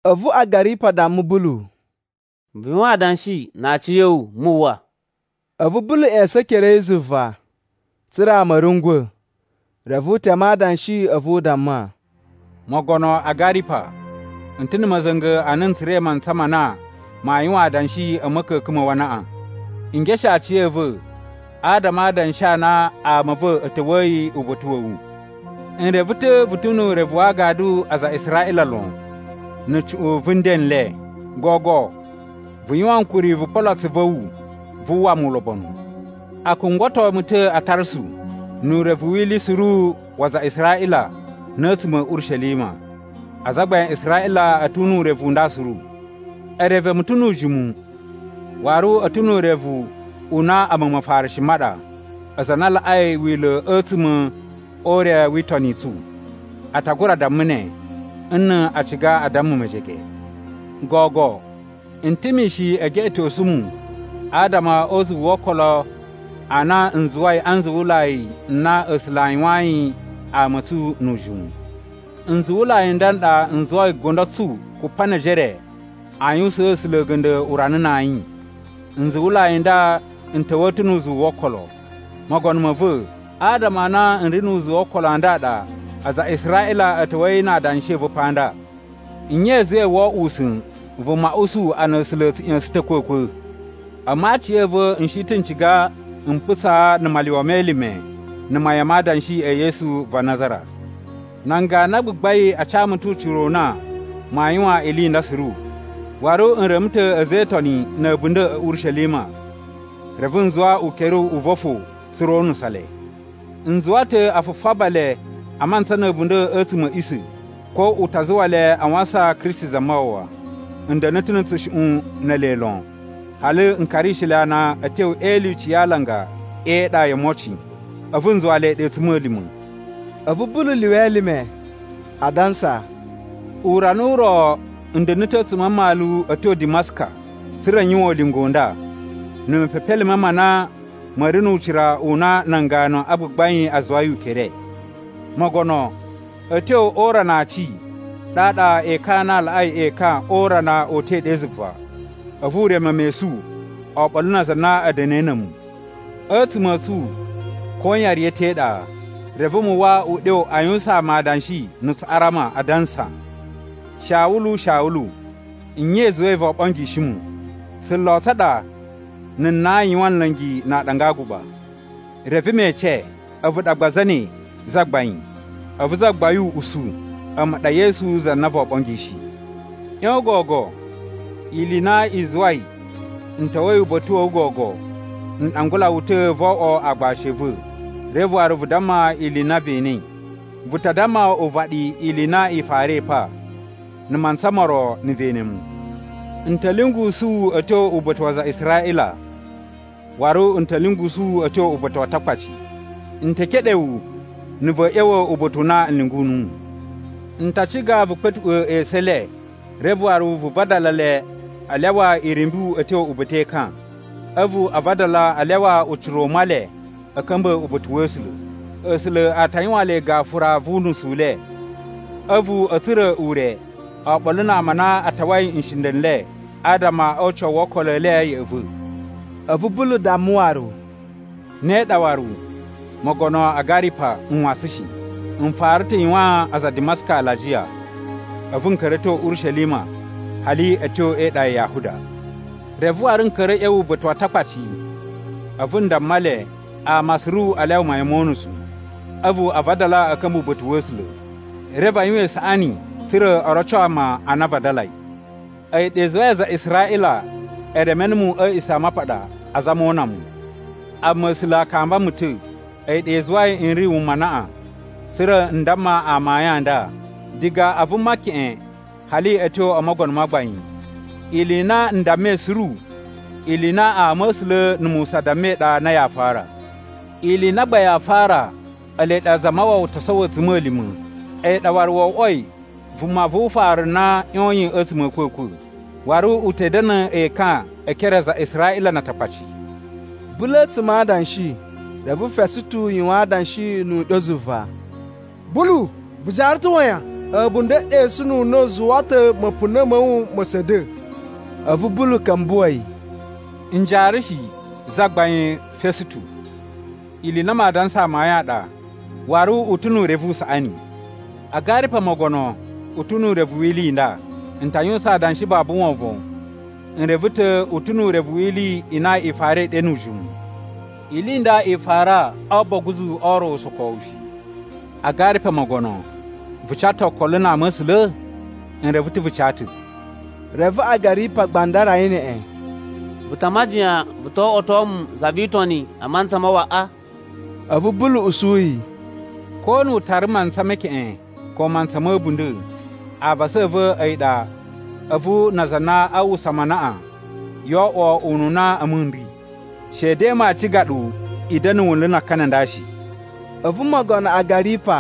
A̱vu Agaripa damma Bulu, “Vu yuwan adanshi na aciya̱wu, mu uwwa.” A̱vu Bulu ꞌya̱sa̱n ekere a̱ yi zuva, tsa̱ra̱ ama a̱ rungwa̱. Reve u teme adanshi, a̱vu u damma, “Mogono Agaripa, n ta̱ na̱ ma̱za̱nga̱ a na n tsura̱i mantsa ma na maa yuwan adanshi a̱ ma̱ka̱ka̱n ma̱ wu anaꞌan. N geshe aciya̱va̱ adama a adanshi a na ama a̱ va̱ a̱ ta̱wa̱yi uba̱ta̱ wa̱ wu. N reve ta̱ vu ta̱ nu urevu wa agadu a aza a Israꞌila lon na̱ cuꞌun vu nden n le. Gogo, vu yuwan ankuri vu polo atsuvu a̱ wu vu uwwa mu ulobonu! “A kungwato mu ta̱ a Tarsu nu urevu wi ili suru wa aza a Israꞌila na̱ a̱tsuma̱ a̱ Urishelima. Azagbain a Israꞌila a̱ ta̱ nu urevu u nda suru. E reve mu ta̱ nu ujimu, waru a̱ ta̱ nu urevu u na a̱mu Mafarishi ma ɗa, aza a na a laꞌai wila̱ a̱tsuma̱ o ure wi itoni i tsu. A ta gura damma ne, nna̱ a ciga a damma mejege. Gogo, n ta̱ mishin e geꞌetosu mu adama o uzuwu wo okolo a na n zuwai a nzuwulai n na A̱sula̱ a yuwayin ama a̱ tsu nu ujimu. Nzuwulai n nda n ɗa n zuwai gundo tsu kupa ne ejere a yuwusaan A̱sula̱ a̱ga̱nda̱ urana na ayin. Nzuwulai n nda n ta̱wa̱a̱ ta̱ nu uzuwu wo okolo. Mogono ma̱ va̱, adama a na n ri nu uzuwu wo okolo a nda a ɗa aza a Israꞌila a̱ ta̱wa̱yi na adanshi a̱ va̱ pa nda. Nye i zuwai woo oꞌwo usa̱n vuma usu a na A̱sula̱ a̱ tsu ꞌya̱sa̱n ta̱ a̱kwa̱kwa̱? “A̱mu aciya̱va̱ n shi ta̱ n ciga n putsaa na̱ malyuwa me elime na̱ mayan ma adanshi e Yesu va Nazara. Nan ganu a gbagbain a ca mu ta̱ ucira u na maa yuwan ili i nda suru, waru n reme ta̱ a̱za̱ e Itoni na̱ a̱bunda̱ a̱ Urishelima, reve n zuwa ukere u va̱ fo tsa̱ra̱ o unusa le. N zuwa ta̱ a fufaba le a mantsa na̱ a̱bunda̱ a̱tsuma̱ a̱ a̱ꞌisa̱, ko u ta zuwa le a wasan Kristi Zamawawa. N da̱na̱ ta̱ na̱ tsushuꞌun ne ele lon, hali n karishi le ana a̱ tyo e ilyuci ya alanga e iɗa yo omocin, a̱vu n zuwa le ɗe a̱tsuma̱lima̱.” A̱vu Bulu lyuwa elime, adansa, “Urana u ro n da̱na̱ ta̱ a̱tsuma̱ a mmalu a̱ tyo Dimaska, tsa̱ra̱ n yuwan ulinga u nda, na̱ mepepelime ma na ma̱ ri nu ucira u na nan ganu a gbagbain a zuwai ukere. Mogono, a̱ tyo o urana a aci, ɗaɗa ekan a na a laꞌai ekan o urana o uta̱i ɗe zuva, a̱vu u reme mu esu oɓolo na aza a na a̱ da̱na̱i na̱ a̱mu. A̱tsuma̱ a̱ tsu, koyan riya̱ ta̱ e iɗa. Reve mu uwwa uɗyo a yuwusaan mu adanshi na̱ Tsuꞌarama, adansa, ‘Shawulu, Shawulu, nye i zuwai voo ɓongishi mu? Tsulo tsa ɗa na̱ nan yuwan nla̱ngi na aaɗanga a aguɓa.’ “Reve me ece, ‘A̱vu ɗa gba zane, Zagbain?’ “A̱vu Zagbain u usu, ‘A̱mu ɗa Yesu za na voo ɓongishi. ꞌYon gogo! Ili i na i zuwai n ta̱wa̱i uba̱ta̱ wa̱ wu gogo, n ɗangula wu ta̱ vo oꞌwo aagbashi a̱ va̱, reve waru vu damma ili i na ve enei. Vu ta damma uvaɗi ili i na i farai pa, na̱ mantsa mo ro na̱ ve ene mu. N ta̱ lyungusu wu a̱ tyo uba̱ta̱ wa aza a Israꞌila, waru n ta lyungusu wu a̱ tyo uba̱ta̱ wa Atakpaci. N te keɗe wu na̱ va̱a̱ ꞌya̱wa̱ uba̱ta̱ u na n lyungu nuwu. N ta ciga vu kpa̱tuꞌwa̱ esu e le, reve waru vu vadala le a lyawa irumbu a̱ tyo uba̱ta̱ e ekan. A̱vu a vadala a lyawa ucira u Male a̱ ka̱mba̱ uba̱ta̱ wa̱ A̱sula̱. A̱sula̱ a ta yuwaan le gafura vu unusu u le, a̱vu a̱ tsura̱ ure oɓolo na ama a na a tawai nshinda̱ n le adama o ucawu wo okolo e le ya̱ꞌa̱ va̱.’” A̱vu Bulu damma waru, “Ne ɗa waru, mogono Agaripa, n wasan shi. N fara ta̱ yuwaan aza a Dimaska alajiya. A̱vu n ka̱ra̱ a̱ tyo Urishelima hali a̱ tyo e iɗa ya Yahuda. Reve waru n ka̱ra̱ a̱ ꞌya̱wa̱ uba̱ta̱ wa Atakpaci. A̱vu n damma le, ama suru a lyawa mayan mo unusu, a̱vu a vadala a̱ ka̱mba̱ uba̱ta̱ wa̱ A̱sula̱. Reve a yuwan isaꞌani tsa̱ra̱ o roco ama a na a vadalai. “A̱yi ɗa i zuwai aza a Israꞌila e reme numu a̱ A̱a̱ꞌisamapaɗa, azama o una mu. Amma A̱sula̱ a kamba mu ta̱, a̱yi ɗa i zuwai n ri wuma anaꞌan, tsa̱ra̱ n damma ama amayun a nda, diga a vuma keꞌen hali a̱ tyo o mogono ma gbain. Ili i na n dammai suru ili i na ama̱sula̱ na̱ Musa dammai ɗa na yaa fara. Ili i na gba yaa fara, ele ɗa Zamawawa to sowo a̱tsuma̱lima̱, a̱yi ɗa waru wo oꞌwoi vuma vu ufaru na ꞌyoyin a̱tsuma̱ a̱ a̱kwa̱kwa̱, waru u ta̱ da̱na̱ ekan e ekere a aza a Israꞌila na Atakpaci.” Bulu a̱tsuma̱ adanshi, reve Fesutu yuwan adanshi nu uɗyo zuva, “Bulu vu jaara ta̱ wayan? A̱bunda̱ e ɗesununa̱ u zuwa ta̱ ma̱puna̱ ma̱ wu ma̱ sa̱da̱!” A̱vu Bulu ka̱mbuwa̱ yi, “N jaara shi, Zagbain Fesutu. Ili i na maa dansa amayun a ɗa, waru u ta̱ nu urevu u saꞌani. Agaripa mogono u ta̱ nu urevu wi ili i nda. N ta yuwusan adanshi babu wovon, n reve ta̱ u ta̱ nu urevu wi ili i na i farai ɗe nu ujimu. Ili i nda i fara o oboguzu o ro usokowu shi. Agaripa mogono, vu ca ta̱ okolo na ama̱sula̱? N reve ta̱ vu ca ta̱—” Reve Agaripa gbandara yi neꞌen, “Vu ta a majiyan vu to oꞌwoto mu za vi Itoni a mantsa waꞌa?” A̱vu Bulu usu yi, “Ko nu u tara mantsa me keꞌen ko mantsa ma̱ a̱bunda̱, avasa a̱ va̱ a̱yi ɗa a̱vu na aza a na a uwwusa mu anaꞌan yoo oꞌwo ununa a̱mu n ri! Shede maa ciga ɗu i da̱na̱ wunlu na akani a nda shi.” A̱vu mogono Agaripa,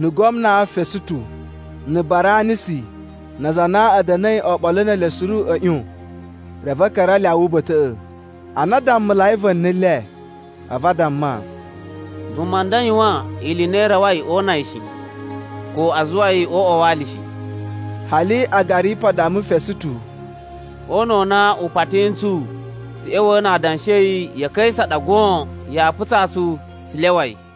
na̱ gwamna Fesutu, na̱ Baranisi, na aza a na a̱ da̱na̱i oɓolo ne ele suru a̱ ꞌyon reve a̱ ka̱ra̱ a lyawa uba̱ta̱ꞌa̱. Ana a dammulai va̱ni le, a̱vu a damma, “Vuma nda yuwan ili i na i rawai o una yi shi, ko a zuwa yi o uꞌwa wa ali shi.” Hali Agaripa damma Fesutu, “O una̱ u na u pati ntsu tsu ꞌya̱wa̱ na adanshi a̱ yi ya̱ Kaisa ɗa goon yaa putsaa tsu tsu lyawa yi.”